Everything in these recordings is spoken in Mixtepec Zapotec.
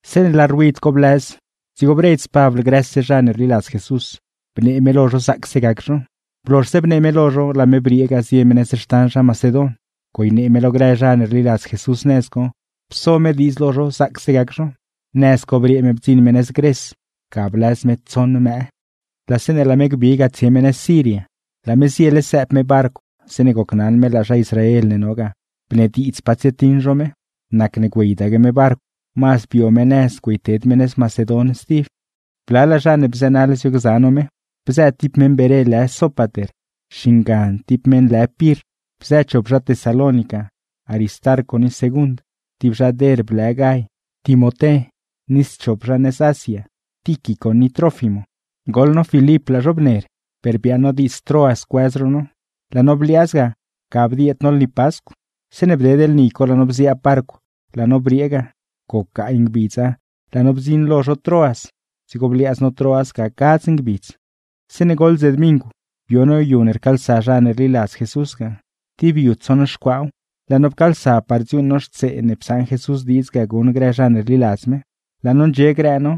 Zeeṉe laa ruid co blëz, dzigo bredz Pabl grëse zha ne rliladz Jesús, bnee me lo zho zaacse gac zho. Blozhse bnee me lo zho, laa me briee ga zie me nëz xtan zha Macedon; güeynee me lo grë zha ne rliladz Jesús nëz co, pso me diidz lo zho zaacse gac zho. Nëz co briee me bdziṉ me nëz Gres. Ga blëz me tsoṉ mëë. Laa zeeṉe laa me gbi ga tsie me nëz Siria, laa me ziele sëëb me barcw zeeṉe gocnaṉ me laa zha Israel ne no ga bnediidz pa tsietiṉ zho me, nacne güeydaque me barcw, mazd bio me nëz güeyted me nëz Macedon. Blalaa zha ne bzënaḻ biogza no me, bzë ti meṉ Beré lë Sópater xingan ti meṉ lë Pirr; bzë chop zha Tesalónica, Aristarco ni Segund; ti zha Derb lë Gay, Timoté, ni schop zha nëz Asia, Tíquico ni Trófimo. Goḻ no Filip laa zho bner, per biaaṉ no diidz Troas cuëz zho no; laa no bliaaz ga, ga bdieed no lni Pascw. Zeeṉe bded lni co laa no bziaab barcw, laa no briee ga. Goc gaay ngbidz no no lo nis laa no bdziṉ lo zho Troas, dzigo bliaaz no Troas ga gadz ngbidz. Zeeṉe goḻ dze dmingw, bio no yu ne rcaalsa zha ne rliladz Jesús ga. Ti yu tsoṉ xcuaaw, laa no pcaalsa par dziuuṉ no xtsee ne psaṉ Jesús diidz ga guṉ grë zha ne rliladz me. Laa no ndxie grë no,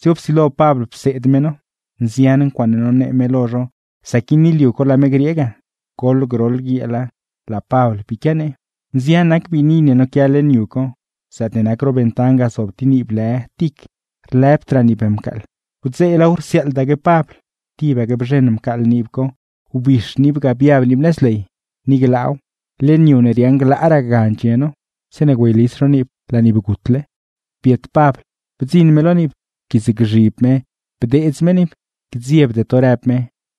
dzigo psilo Pabl pseed me no; nzian ncuaaṉe nonee me lo zho sac guini liu co laa me griee ga; goḻ groḻ guieela rsiaaḻdaque me. Nzian nac biini ne noquia leṉ yu co; zaatne nac ro ventan ga zob ti niib lë Tic. Wdzeelaaw rsiaaḻdaque Pabl, tibaque bzheṉ mcaaḻ niib co, wbix niib ga biab niib nëz ley; ni glaaw, leṉ yu ne riaaṉ glaaraa ga ndxie no. Zeeṉe güeylis zho niib laa niib gutle. Biet Pabl, bdziṉ me lo niib bdeedz me niib. ―¡Gdziebde to! ―rëb me―.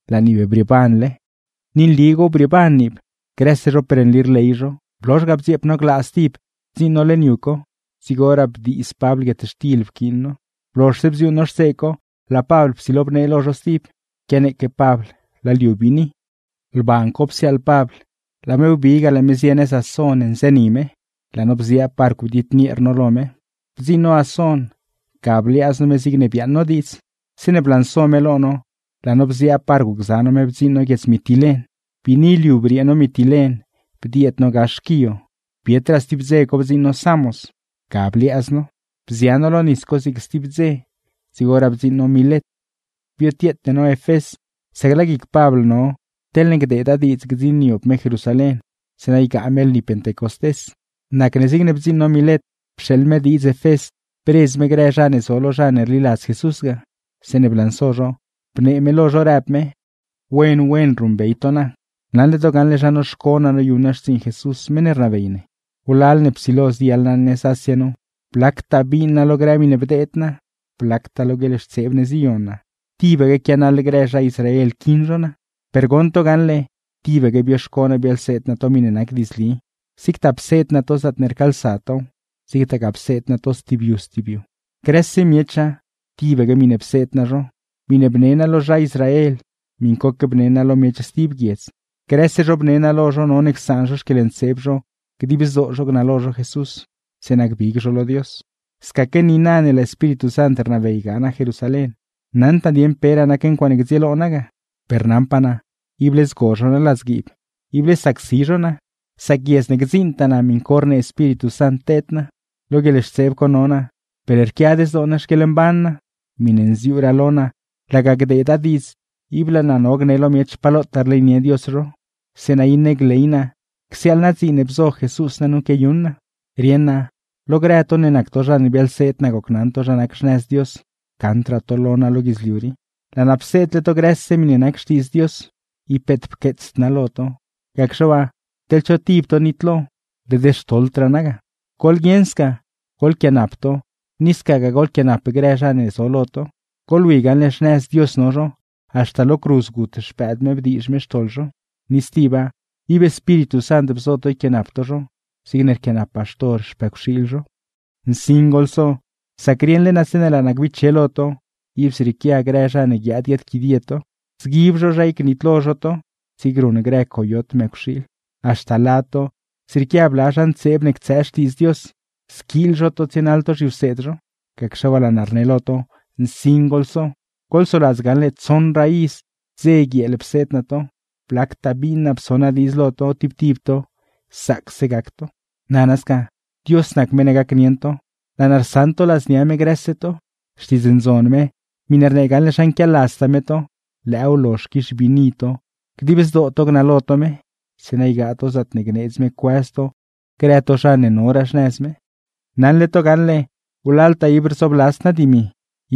¡Zrieeban niib! ¡Ni nligaaw brieeban niib! Grëse zho per nli rley zho. Blozh ga bdzieep no glaa stib bdziṉ no leṉ yu co, dzigoraa bdiiz Pabl guietxtil pquiin no. Blozhse bdziuuṉ no xtsee co, laa Pabl psilo bnee lo zho stib, quianeeque Pabl laa liu biini. Lban co psiaaḻ Pabl, laa me wbi ga laa me zie nëz Ason nzëni me; laa no bziaab barcw bdiednieer no lo me. Bdziṉ no Ason ga bliaaz no me zigne biaaṉ no diidz. Zeeṉe blanso me lo no, laa no bziaab barcw gza no me bdziṉ no guiedz Mitilen. Biini liu briee no Mitilen, bdieed no gax Quío, bietraa stib dze co bdziṉ no Samos, ga bliaaz no; bzia no lo nis co zig sti dze dzigoraa bdziṉ no Milet. Biotieete no Efés, sac laa guic Pabl no gdziṉniob me Jerusalén, zeeṉa ygaa me lni Pentecostés. Nacne zigne bdziṉ no Milet pxeeḻ me diidz Efés bredz me grë zha ne zo lo zha ne rliladz Jesús ga. Zeeṉe blanso zho, bnee me lo zho rëb me: ―Wen wen ruṉbey to naa, naṉle to gaṉle zha noxco naa noyuṉ naa xtsiiṉ Jesús meṉ ne rnabey ne. Wlal ne psilo ziyaḻ naa nëz Asia nu, blactaa biin naa lo grë miṉe bdeed naa, blactaa lo guieḻxtseeb ne ziyo naa, tibaque quianaḻ grë zha Israel quiṉ zho naa. Per goṉ to gaṉle, tibaque bioxco naa biaḻseed naa to miṉe nac diidzli, zigtaa pseed naa to zaatne rcaalsa tow, zigtagaa pseed naa to stib yu stib yu. Grëse miecha, tibaque miṉe pseed naa zho, miṉe bne naa lo zha Israel miṉcoque bne naa lo miech stib guiedz; grëse zho bnee naa lo zho none csaan zho xquieḻntseeb zho dib zdoo zho gnalo zho Jesús, zeeṉa gbig zho lo Dios. ’Scaque niina ne laa Espíritu Sant rnabey ga naa Jerusalén, naṉd naa dieṉ peraa nac ncuaaṉe gdzieelo naa ga; per naṉpaa naa ible zgo zho naa ladzguiib, ible sacsi zho naa, sac guiedz ne gdziiṉtaa naa miṉ co rnee Espíritu Sant teed naa. Lo guieḻxtseeb co no naa per rquiad zdoo naa xquieḻmban naa; miṉe nziuuraa lo naa laga gdeeda diidz ib laa naa no gne lo miech pa lotaa rleynie Dios zho, zeeṉa iṉe gley naa csiaaḻ naa dziin ne bzo Jesús naa nu quiayuṉ naa. Rieṉ naa lo grë to ne nac to zha ne biaḻseed naa gocnaṉ to zha nac xnëz Dios, gaṉdraa to lo naa lo guidzliu rii. Laa naa pseedle to grëse miṉe nac Xtiidz Dios, ib peet pqueetsd naa lo to; gacxe waa, teḻ cho tib to nitlo, led xtoḻdraa naa ga. Goḻguieṉ sca, ¡goḻquianap to, ni scagaa goḻquianap grë zha ne zo to lo! ¡Goḻwi gaṉle xnëz Dios no zho, haxta lo cruz gut Xpëëd me bdiizh me xtoḻ zho! Ni stiba, ¡ib Espíritu Sant bzo to yquianap to zho zigne rquianap baxtor xpëcwxiil zho! ’¡Nsin goḻso! Sac rieṉle naa zeeṉe laa naa gbiche lo to, ib zrieequia grë zha ne guiaad guiaadquidie to, zguib zho zha gnitlo zho to zigne ruṉ grë coyot mëcwxiil. Haxta lad to, zrieequia bla zha ntseeb ne ctsëë Xtiidz Dios, squiil zho to tsienaḻ to zhiwseed zho. Gacxe waa laa naa rne lo to, ¡nsin goḻso! Goḻsoladz gaṉle tsoṉraa iz, dze guieel pseed naa to, blactaa biin naa pso naa diidz lo to tib tib to zaacse gac to. Dios nac meṉ ne gacnieṉ to, laa naa rsaṉ to ladznia me grëse to; Xtiidz Ndzon me miṉe rnee gaṉle zha nquialadztaa me to, lëëw lozh quix biini to dib zdoo to gnalo to me, zeeṉa ygaa to zaatne gneedz me cuëz to grë to zha ne noraa xnëz me. ’Wlaltaa ib rzobladzd naa dimi,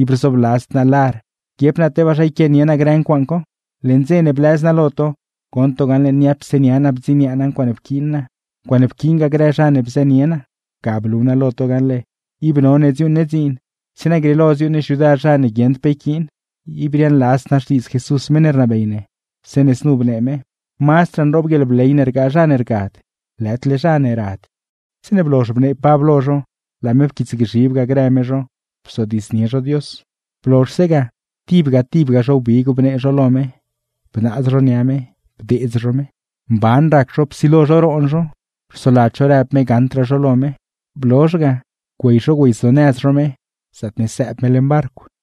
ib rzobladzd naa lar, guiep naa tebaa zha yquianie naa grë ncuaaṉ co. Leṉ dze ne blëz naa lo to, goṉ to gaṉle niapse nia naa bdziniaa naa ncuaaṉe pquiin naa, ncuaaṉe pquiingaa grë zha ne bzënie naa. Ga blu naa lo to gaṉle, ib none dziuuṉ ne dziin zeeṉa grieelo dziuuṉ ne xyudar zha ne guieṉd pe yquiin. Ib riaaṉladzd naa xtiidz Jesús meṉ ne rnabey ne, zeeṉe znu bnee me: “Mazdraa nroob guieḻbley ne rgaa zha ne rgad, lëdle zha ne rad.” Zeeṉe blozh bnee Pabl lo zho, laa me pquiitsgzhib ga grë me zho bzodiidznie zho Dios. Blozhse ga, tibga tibga zho wbig bnee zho lo me, bnaaz zho nia me, bdeedz zho me. Mban rac zho psilo zho roon zho, rsoladz zho rëb me gaṉdraa zho lo me. Blozh ga, güey zho güeyzonëz zho me zaatne sëëb me barcw.